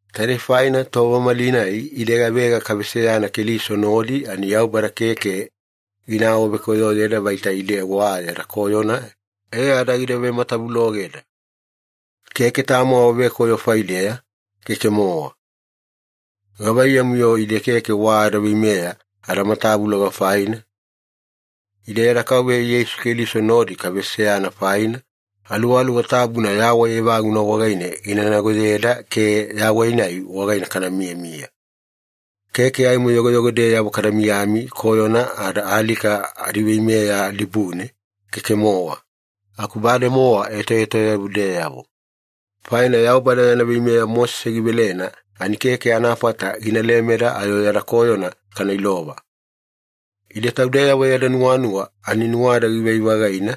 Taidei faina tova malinai ide gavega kaveseyana Keliso nodi ani Yaubada keke gina awavekoyoyeda vaita ide wa yada koyona e ada gida matavulogeda. Keke tamo awavekoyo faideya, keke-mowa. Gavaiyamu-yo ide keke wa adaveimeya adamatavuloga faina? Ide yada Kauveya Yeisu Keliso nodi kaveseyana faina, Aluwaluwa Tabuna yawai evaguna wagaine ginagoyeda ke yawai-nai wagaine kamiyamiya. Keke aimo yogoyogodeyavo kada miyami koyona ada alika adiveimeya dibune, keke-mowa. Aku bademowa etoetoyavudeyavo. Faina Yaubada yana veimeya Mosese givelena ani keke anafata gina lemeda ayo yada koyona kana ilova. Ide taudeyavo yada nuwanuwa ani nuwada givai-vagaina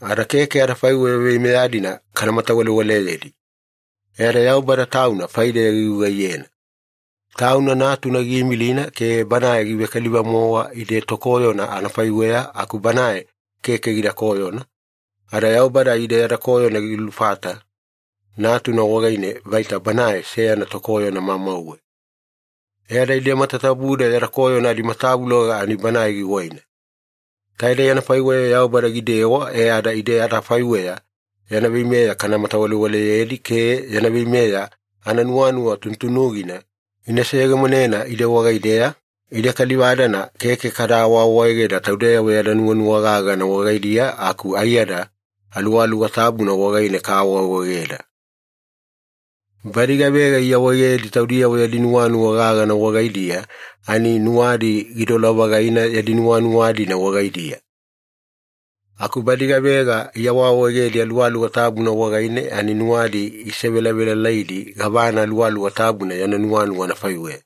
ada keke adafaiweya veimeya-dina kana matawalewaleyedi. E ada Yaubada Tauna faideya gigugaiyena. Tauna Natuna giimilina ke Banae givekaliva-mowa ide tokoyona anafaiweya aku Banae keke gida koyona, ada Yaubada ide yada koyona gilufata Natuna wagaine vaita Banae seyana tokoyona mamauwe. E ada ide matatabuda yada koyona adimatavuloga ani Banae giwaina. Taidei anafaiweya Yaubada gidewa e ada ide adafaiweya yana veimeya kana matawalewaleyedi ke yana veimeya ananuwanuwa tunutunugina gina seyegemonena ide wagaideya, ide kaliva-dana keke kada awaawaegeda taudeyavo yada nuwanuwa gagana wagaidiya aku aiyada Aluwaluwa Tabuna wagaine kaawaawaegeda. Badi gavega iawaegedi taudiyavo yadi nuwanuwa gagana wagaidiya ani nuwadi gidola-vagaina yadi nuwanuwa-dina wagaidiya. Aku badi gavega iawaawaegedi Aluwaluwa Tabuna wagaine ani nuwadi isevelavelalaidi gavana Aluwaluwa Tabuna yana nuwanuwa anafaiweya.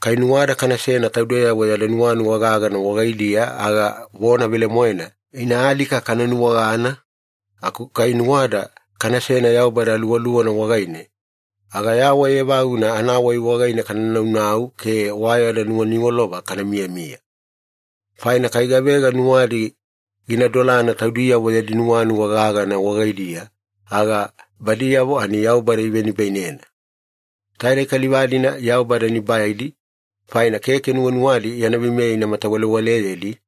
Kai nuwada kanasena taudeyavo yada nuwanuwa gagana wagaidiya aga vona velemoena ina alika kana nuwagana, aku kai nuwada kanasena Yaubada Aluwaluwana wagaine, aga yawai evaguna anawai wagaine kana naunau ke wa yada nuwaniwalova kana miyamiya. Faina kai gavega nuwadi gina dolana taudiyavo yadi nuwanuwa gagana wagaidiya, aga badiyavo ani Yaubada ivenibainena. Taidei kaliva-dina Yaubada nibaidi, faina keke nuwanuwadi yana veimeya ina matawalewaleyedi,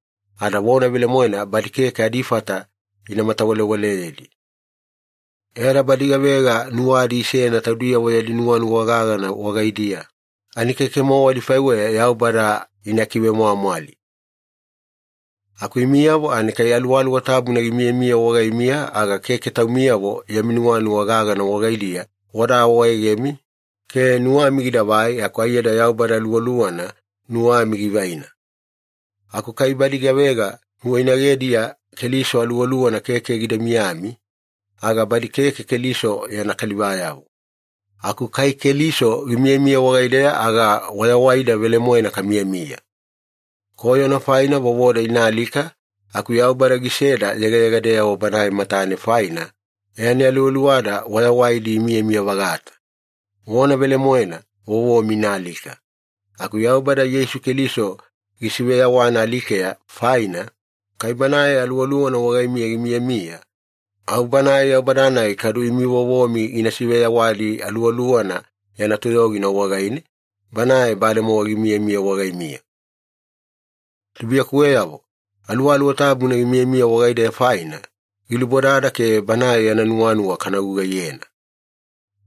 ada vona velemoena badi keke adifata ina matawalewaleyedi. E ada badi gavega nuwadi isena taudiyavo yadi nuwanuwa gagana wagaidiya ani keke-mowa adifaiweya Yaubada ina kivemwamwali. Aku imiyavo ani kai Aluwaluwa Tabuna gimiyamiya wagaimiya, aga keke taumiyavo yami nuwanuwa gagana wagaidiya wada awaegemi ke nuwami gidavai aku aiyada Yaubada Aluwaluwana nuwami givaina. Aku kai badi gavega nuwainagediya Keliso Aluwaluwana keke gida miyami, aga badi keke Keliso yana kalivayavo. Aku kai Keliso gimiyamiya wagaideya aga wayawaida velemoena kamiyamiya. Koyona faina vovoda ina alika, aku Yaubada giseda yegayegadeyavo Banae matane faina, e ani aluwaluwada wayawaidi imiyamiya-vagata. Vona velemoena vovomi ina alika. Aku Yaubada Yeisu Keliso gisiveyawana alikeya faina, kai Banae Aluwaluwana wagaimiya gimiyamiya, au Banae Yaubada-nai kadu imi vovomi gina siveyawadi Aluwaluwana yana toyogina wagaine, Banae bademowa gimiyamiya wagaimiya. Tubuiyakuweyavo, Aluwaluwa Tabuna gimiyamiya wagaideya faina, gilubodada ke Banae yana nuwanuwa kana gugaiyena.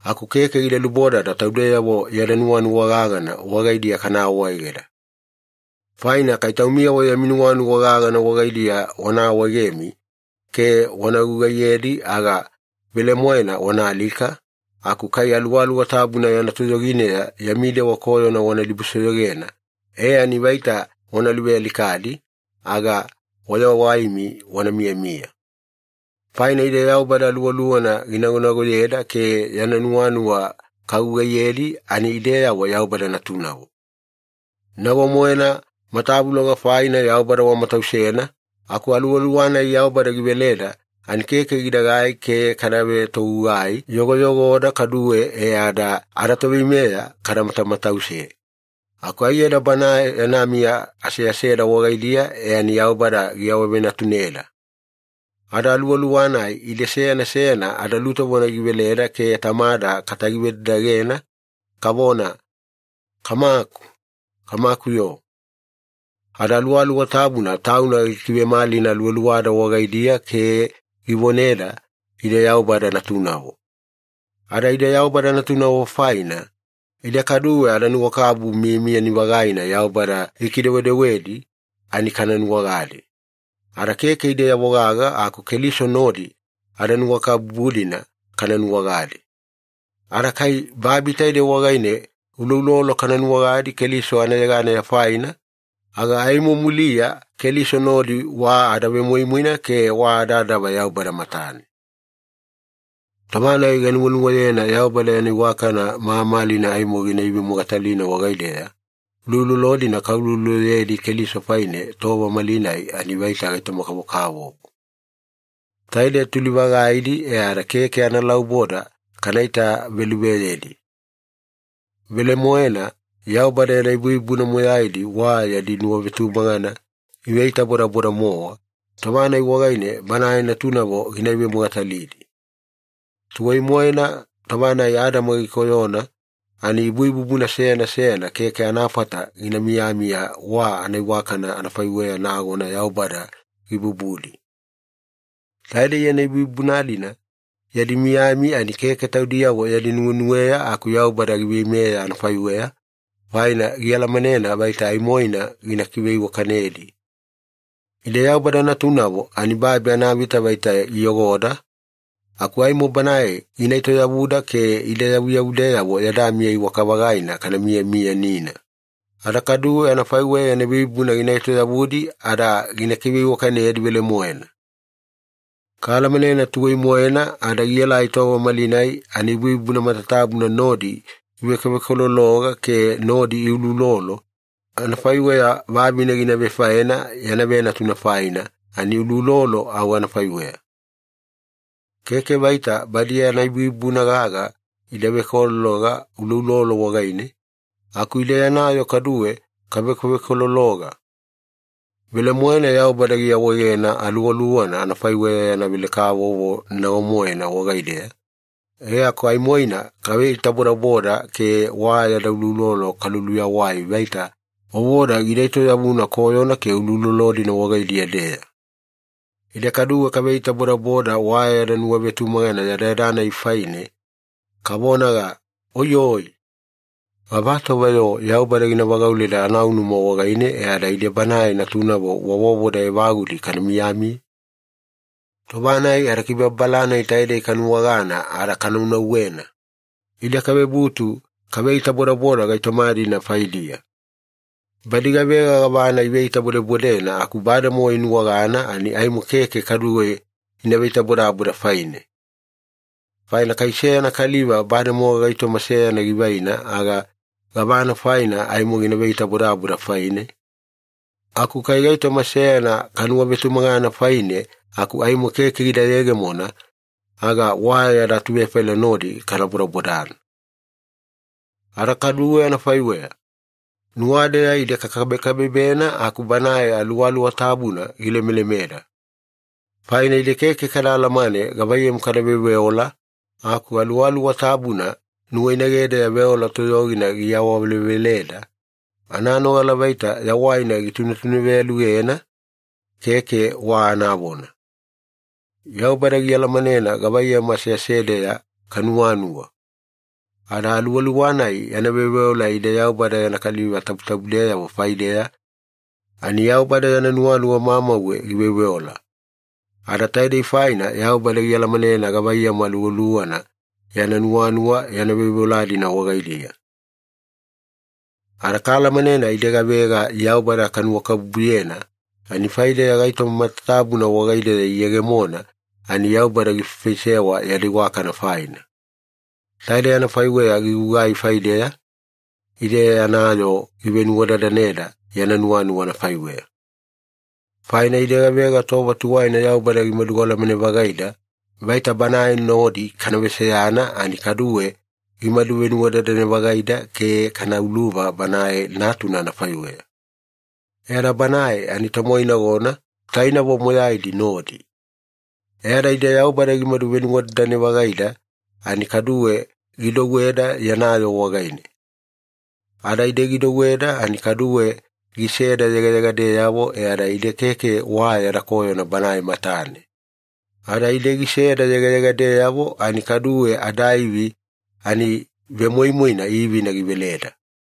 Aku keke gida lubodada taudeyavo yada nuwanuwa gagana wagaidiya kana awaegeda. Faina kai taumiyavo yami nuwanuwa gagana wagaidiya wana awaegemi ke wana gugaiyedi aga velemoena wana alika, aku kai Aluwaluwa Tabuna yana toyogineya yami dewa koyona wana dibusoyogena e ani vaita wana luvealikadi, aga wayawaimi wana miyamiya. Faina ide Yaubada Aluwaluwana ginagonagoyeda ke yana nuwanuwa kagugaiyedi ani ideyavo Yaubada natunavo. Nago-moena matavuloga faina Yaubada wamatausena, aku Aluwaluwa-nai Yaubada giveleda ani keke gidagai ke kada vetogugai yogoyogoda kaduwe e ada adaToveimeya kada matamatause. Aku aiyada Banae yana miya aseaseda wagaidiya e ani Yaubada giawavenatuneda. Ada Aluwaluwa-nai ide seyana seyana adalutovona giveleda ke Tamada katagivedadagena, kavona, “Kamaku, Kamaku-yo!” Ada Aluwaluwa Tabuna Tauna gikivemalina aluwaluwada wagaidiya ke givoneda ide Yaubada natunavo. Ada ide Yaubada natunavo faina, ide kaduwe adanuwakabubu miyamiyani-vagaina Yaubada gikidewedewedi ani kana nuwagadi. Ada keke ideyavo gaga aku Keliso nodi adanuwakabubu-dina kana nuwagadi. Ada kai babi taide wagaine uloulolo kana nuwagadi Keliso anayegana faina, aga aimo muliya Keliso nodi wa adavemoimoina ke wa adadava Yaubada matane. Tova-nai ganuwanuwayena Yaubada yana iwakana mamalina aimo gina ivemogatalina wagaideya, uloulolo-dina kaulouloloyedi Keliso faine tova malinai ani vaita gaitoma-kavokavovo. Taide tuli-vagaidi e ada keke analauboda kana itaveluveyedi. Velemoena, Yaubada yana ibuibubuna moyaidi wa yadi nuwavetumagana iveitabodaboda-mowa tova-nai wagaine Banae natunavo gina ivemogatalidi. Tuwai-moena tova-nai Adama gikoyona ani ibuibubuna seyana seyana keke anafata gina miyamiya wa anaiwakana anafaiweya nagona Yaubada gibubudi. Taidei yana ibuibubuna-dina yadi miyami ani keke taudiyavo yadi nuwenuweya aku Yaubada giveimeya anafaiweya, faina gialamanena vaita aimoina gina kiveiwakanedi. Ide Yaubada natunavo ani babi anavita vaita iyogoda, aku aimo Banae gina etoyavuda ke ide yavuyavudeyavo yada miya iwaka-vagaina kana miyamiyanina, ada kaduwe anafaiweya yana ibuibubuna gina etoyavudi ada gina kiveiwakanedi velemoena. Kaalamanena tuwai-moena ada gielai tova malinai ani ibuibubuna matatabuna nodi ivekovekolologa ke nodi iuloulolo, anafaiweya vavine gina vefaena yana venatuna faina ani anauloulolo au anafaiweya. Keke vaita badi yana ibuibubuna gaga ida vekolologa uloulolo wagaine, aku ide yana yoo kaduwe kavekovekolologa. Velemoena Yaubada giawaegena Aluwaluwana anafaiweya yana velekavovo nago-moena wagaideya, e aku aimoina kaveitabodaboda ke wa yada uloulolo kaluluyawai vaita vovoda gida etoyavuna koyona ke uloulolo-dina wagaidiya-deya. Ide kaduwe kaveitabodaboda wa yada nuwavetumagana yadayada-nai faine, kavonaga, “Oiyoi! Gavatova-yo Yaubada gina vagauleda anaunuma wagaine e ada ide Banae natunavo wa vovoda evagudi kana miyamiya?” Tova-nai adakibababala-nai taidei kanuwagana ada kanaunauwena, ide kavebutu kaveitabodaboda gaitoma-dina faidiya. Badi gavega gavana iveitabodebodena aku bademowa inuwagana, ani aimo keke kaduwe ina veitabodaboda faine. Faina kai seyana kaliva bademowa gaitoma seyana givaina aga gavana faina aimo gina veitabodaboda faine? Aku kai gaitoma seyana kanuwavetumagana faine aku aimo keke gida yegemona, aga wa yada atuvefaila nodi kana bodabodana. Ada kaduwe anafaiweya, nuwadeya ide kakabekabebena aku Banae Aluwaluwa Tabuna gilemelemeda. Faina ide keke kada alamane gavaiyamu kada veoveola, aku Aluwaluwa Tabuna nuwainagedeya veola toyogina giawaveleveleda, ananogala vaita yawaina gitunetuneveyalugena, keke wa anavona. Yaubada gialamanena gavaiyamu aseasedeya kanuwanuwa. Ada Aluwaluwa-nai yana veoveola ide Yaubada yana kaliva tabutabudeyavo faideya, ani Yaubada yana nuwanuwa mamauwe giveoveola. Ada taidei faina Yaubada gialamanena gavaiyamu Aluwaluwana yana nuwanuwa yana veoveola-dina wagaidiya. Ada kaalamanena ide gavega Yaubada kanuwakabubuyena ani faideya gaitoma matatabuna wagaideya iyegemona ani Yaubada gifaifaisewa yada iwakana faina. Taidei anafaiweya gigugai faideya, ide yana yoo givenuwadadaneda yana nuwanuwa anafaiweya. Faina ide gavega tova tuwaina Yaubada gimadu alamane-vagaida vaita Banae nodi kana veseyana ani kaduwe gimadu venuwadadane-vagaida ke kana uluva Banae Natuna anafaiweya. E ada Banae ani tomoinagona, tainavo moyaidi nodi. E ada ide Yaubada gimadu venuwadadane-vagaida ani kaduwe gidouweda yana yoo wagaine. Ada ide gidouweda ani kaduwe giseda yegayegadeyavo e ada ide keke wa yada koyona Banae matane. Ada ide giseda yegayegadeyavo ani kaduwe adaivi ani vemoimoina ivina giveleda.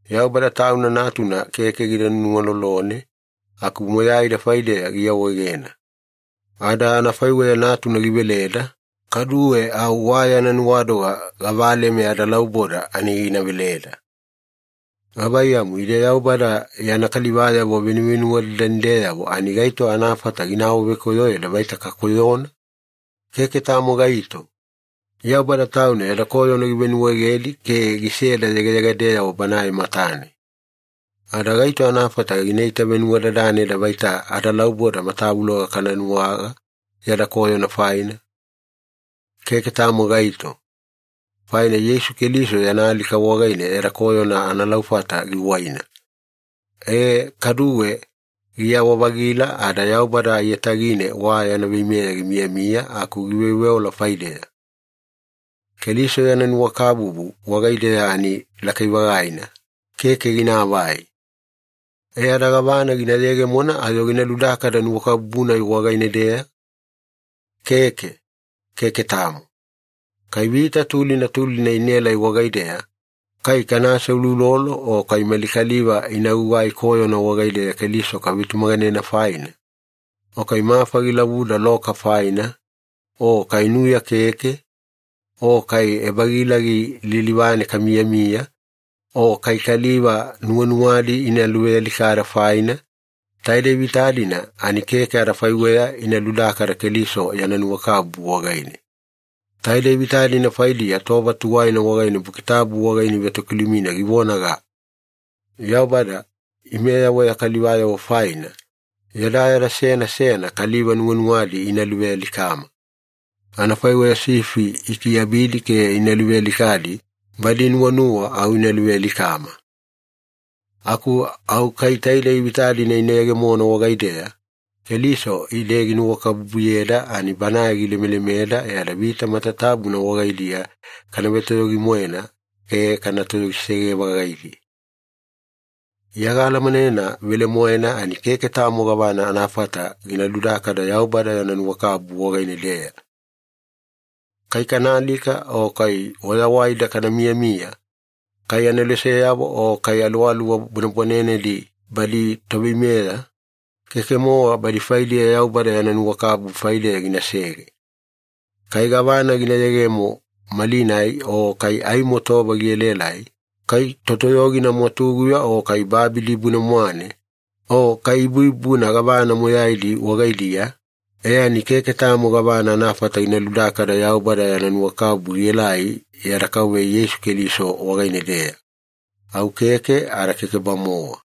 Yaubada Tauna Natuna keke gida nuwalolone aku moyaida faideya giawaegena. Ada anafaiweya Natuna giveleda, kaduwe au wa yana nuwadoga gavaleme adalauboda ani gina veleda. Gavaiyamu, ide Yaubada yana kalivayavo venuvenuwadadanideyavo ani gaito anafata gina awavekoyoyeda vaita kakoyona? Keke tamo gaito! Yaubada Tauna yada koyona givenuwaegedi ke giseda yegayegadeyavo Banae matane. Ada gaito anafata gina itavenuwadadaneda vaita adalauboda matavuloga kada nuwaga yada koyona faina? Keke tamo gaito! Faina Yeisu Keliso yana alika wagaine yada koyona analaufata giwaina. E, kaduwe giyawa-vagila ada Yaubada aiyatagine wa yana veimeya gimiyamiya aku giveoveola faideya. Keliso yana nuwakabubu wagaideya ani lakai-vagaina, keke ginaavai. E ada gavana gina yegemona ayo gina ludakada nuwakabubu-nai wagaine-deya? Keke, keke tamo. Kai vita tulina tulina inaelai wagaideya, kai kana aseuloulolo o kai mali kaliva ina gugai koyona wagaideya Keliso kavetumaganena faina, o kai mafa gilavuda loka faina, o kai nuya keke, o kai ebagilagi lilivane kamiyamiya, o kai kaliva nuwanuwadi ina luvealikada faina, taidei vita-dina ani keke adifaiweya ina ludakada Keliso yana nuwakabubu wagaine. Taidei vita-dina faidiya tova tuwaina wagaine Buki Tabu wagaine ivetokilumina givonaga, “Yaubada, imeyavo ya kalivayavo faina, yadayada seyana seyana kaliva nuwanuwadi ina luvealikama. Anafaiweya sifi ikiabidi ke ina luvealikadi, badi inuwanuwa au ina luvealikama.” Aku au kai taidei vita-dina ina yegemona wagaideya, Keliso ide ginuwakabubuyeda ani Banae gilemelemeda e ada vita matatabuna wagaidiya kana vetoyogi-moena ke kana toyogisege-vagaidi. Iya gaalamanena velemoena ani keke tamo gavana anafata gina ludakada Yaubada yana nuwakabubu wagaine-deya. Kai kana alika o kai wayawaida kana miyamiya, kai aneloseyavo o kai aluwaluwa bwanebwanenedi badi toveimeya, keke-mowa badi faidiya Yaubada yana nuwakabubu faideya ginasege. Kai gavana gina yegemo malinai o kai aimo tova gielaelai, kai totoyogina mwatuguya o kai babi dibune-mwane, o kai ibuibubuna gavana moyaidi wagaidiya, e ani keke tamo gavana anafata gina ludakada Yaubada yana nuwakabubu gielai yada Kauveya Yeisu Keliso wagaine-deya. Au keke ada keke-bamowa.